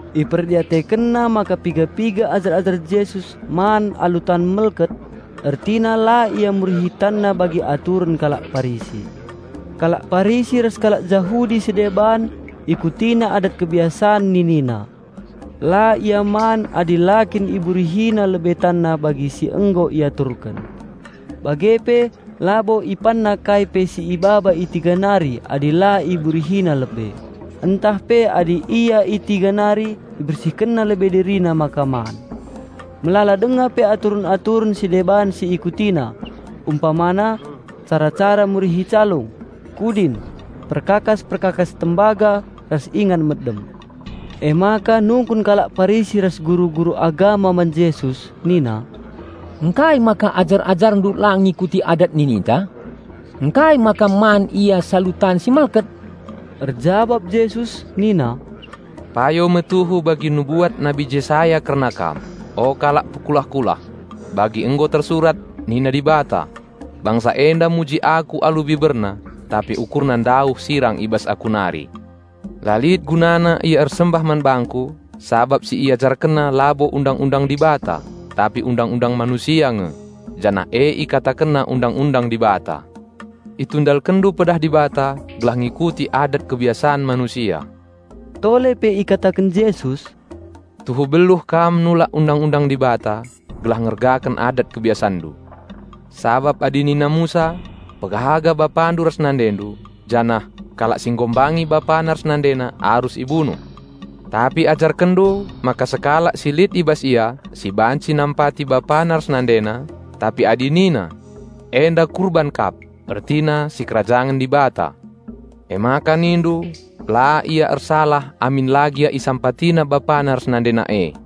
Iperdiatekenna maka piga-piga ajar-ajar Jesus man alu tan melket, ertina la ia murihi tanna bagi aturen kalak Parisi. Kalak Parisi ras kalak Jahudi si deban ikutina adat kebiasan ninina. La ia man adi la kin iburihina lebe tanna bagi si nggo iaturken. Bage pe labo ipanna kai pe si ibaba i tiga nari adi la iburihina lebe (ntah pe adi ia i tiga nari ibersihkenna lebe dirina maka man). Melala denga pe aturen-aturen si deban si ikutina, umpamana: cara-cara murihi calung, kudin, perkakas-perkakas tembaga ras ingan medem. Emaka nungkun kalak Parisi ras guru-guru agama man Jesus nina, "Ngkai maka ajar-AjarNdu la ngikuti adat nininta? Ngkai maka man ia salu tan si melket?" Erjabap Jesus nina, "Payo me tuhu bagi nubuat Nabi Jesaya kerna kam, o kalak pekulah-kulah, bagi nggo tersurat, 'Nina Dibata: bangsa enda muji Aku alu biberna, tapi ukurna ndauh sirang i bas Aku nari. La lit gunana ia ersembah man bangKu, sabap si iajarkenna labo Undang-undang Dibata, tapi undang-undang manusia nge, janah e ikatakenna Undang-undang Dibata!' Itundalkenndu pedah Dibata, gelah ngikuti adat kebiasan manusia." Tole pe ikataken Jesus, "Tuhu beluh kam nulak Undang-undang Dibata, gelah ngergaken adat-kebiasanndu. Sabap adi nina Musa, 'Pehaga bapandu ras nandendu' janah, 'Kalak si enghina bapana ras nandena arus ibunuh.' Tapi ajarkenndu maka sekalak si lit i bas ia, si banci nampati bapana ras nandena, tapi adi nina, 'Enda Kurban kap' (ertina sikerajangen Dibata), emaka nindu la ia ersalah amin la gia isampatina bapana ras nandena e.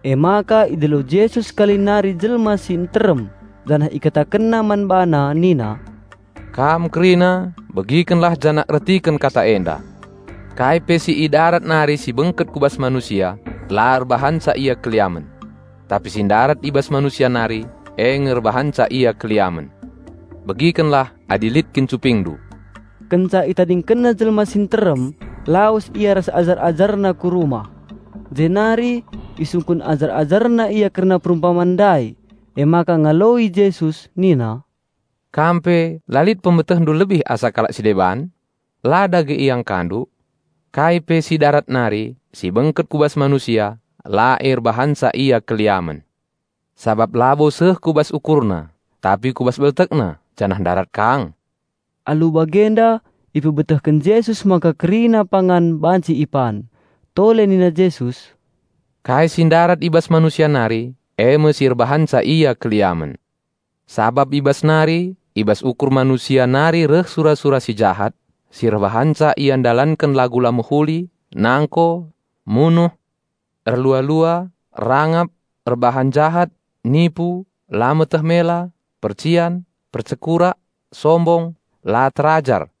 Emaka idilo Jesus sekali nari jelma si nterem janah IkatakenNa man bana nina, "Kam kerina, begikenlah janah ertiken kata enda. Kai pe si i darat nari si bengket ku bas manusia, la erbahanca ia erdosa. Tapi si ndarat i bas manusia nari, e nge erbahanca ia erdosa." (Begikenlah adi lit kin cupingndu!) Kenca ItadingkenNa jelma si nterem, lawes Ia ras ajar-AjarNa ku rumah. Jenari isungkun ajar-AjarNa Ia kerna perumpaman ndai. Emaka ngaloi Jesus nina, "Kam pe la lit pemetehndu lebih asa kalak si deban? La dage iangkandu? Kai pe si darat nari, si bengket ku bas manusia, la e erbahanca ia erdosa. Sabap labo seh ku bas ukurna, tapi ku bas beltekna, janah ndarat kang." (Alu bagenda ipebetehken Jesus maka kerina pangan banci ipan.) Tole nina Jesus, "Kai si ndarat i bas manusia nari, e me si erbahanca ia erdosa. Sabap i bas nari, i bas ukur manusia nari reh sura-sura si jahat, si erbahanca ia ndalanken lagu la mehuli, nangko, munuh, erlua-lua, rangap, erbahan jahat, nipu, la meteh mela, percian, percekurak, sombong, la terajar.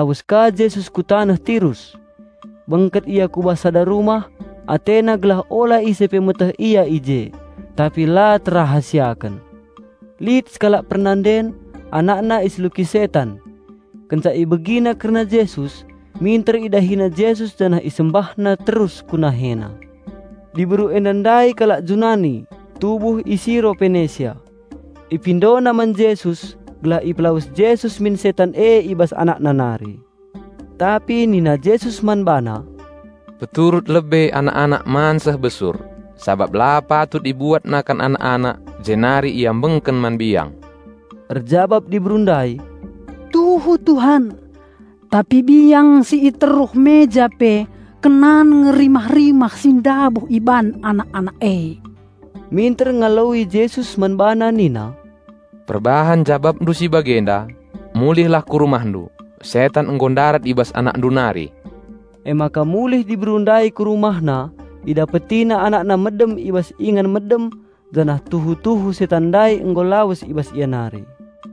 Kenca bage lawes ka Jesus ku taneh Tirus. Bengket Ia ku bas sada rumah, AteNa gelah ola ise pe meteh Ia i je. Tapi la terrahasiaken. Lit sekalak pernanden, anakna iseluki setan. Kenca ibegina kerna Jesus, minter idahina Jesus janah isembahna terus ku NaheNa. Diberu enda ndai kalak Junani, tubuh i Siro Penesia. Ipindona man Jesus gelah ipelawes Jesus min setan e i bas anakna nari. Tapi nina Jesus man bana, "Peturut lebe anak-anak man seh besur, sabap la patut ibuat nakan anak-anak jenari ibenterken man biang." Erjabap diberu ndai, "Tuhu, Tuhan. Tapi biang si i teruh meja pe kenan nge rimah-rimah si ndabuh iban anak-anak e." Minter ngaloi Jesus man bana nina, "Perbahan jabapndu si bagenda, mulihlah ku rumahndu, setan nggo ndarat i bas anakndu nari." Emaka mulih diberu ndai ku rumahna, idapetina anakna medem i bas ingan medem janah tuhu-tuhu setan ndai nggo lawes i bas ia nari.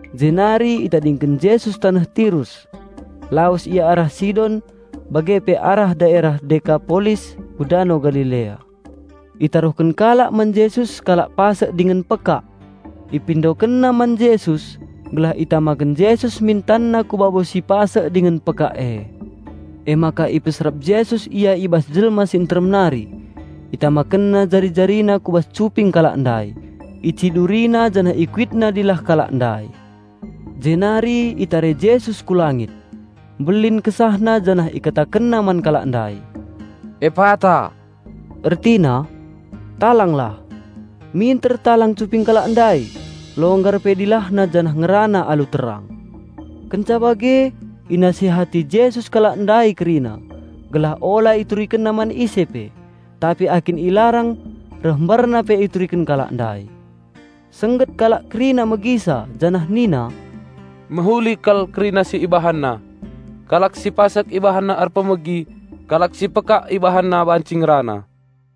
Jenari itadingken Jesus taneh Tirus. Lawes Ia arah Sidon bage pe arah daerah Dekapolis ku Dano Galilea. Itaruhken kalak man Jesus sekalak pasek dingen pekak. Ipindokenna man Jesus gelah itamaken Jesus min TanNa ku babo si pasek dingen pekak e. Emaka ipeserap Jesus ia i bas jelma si nterem nari. ItamakenNa jari-JariNa ku bas cuping kalak ndai, IciduriNa janah IkuitNa dilah kalak ndai. Jenari itare Jesus ku langit. Mbelin KesahNa janah IkatakenNa man kalak ndai, "Epata," ertina, "Talanglah". Minter talang cuping kalak ndai, longgar pe dilahna janah ngerana alu terang. Kenca bage inasihati Jesus kalak ndai kerina, gelah ola iturikenna man ise pe. Tapi akin ilarang reh mbarna pe ituriken kalak ndai. Sengget kalak kerina megisa janah nina, "Mehuli kal kerina si IbahanNa. Kalak si pasek IbahanNa erpemegi, kalak si pekak IbahanNa banci ngerana."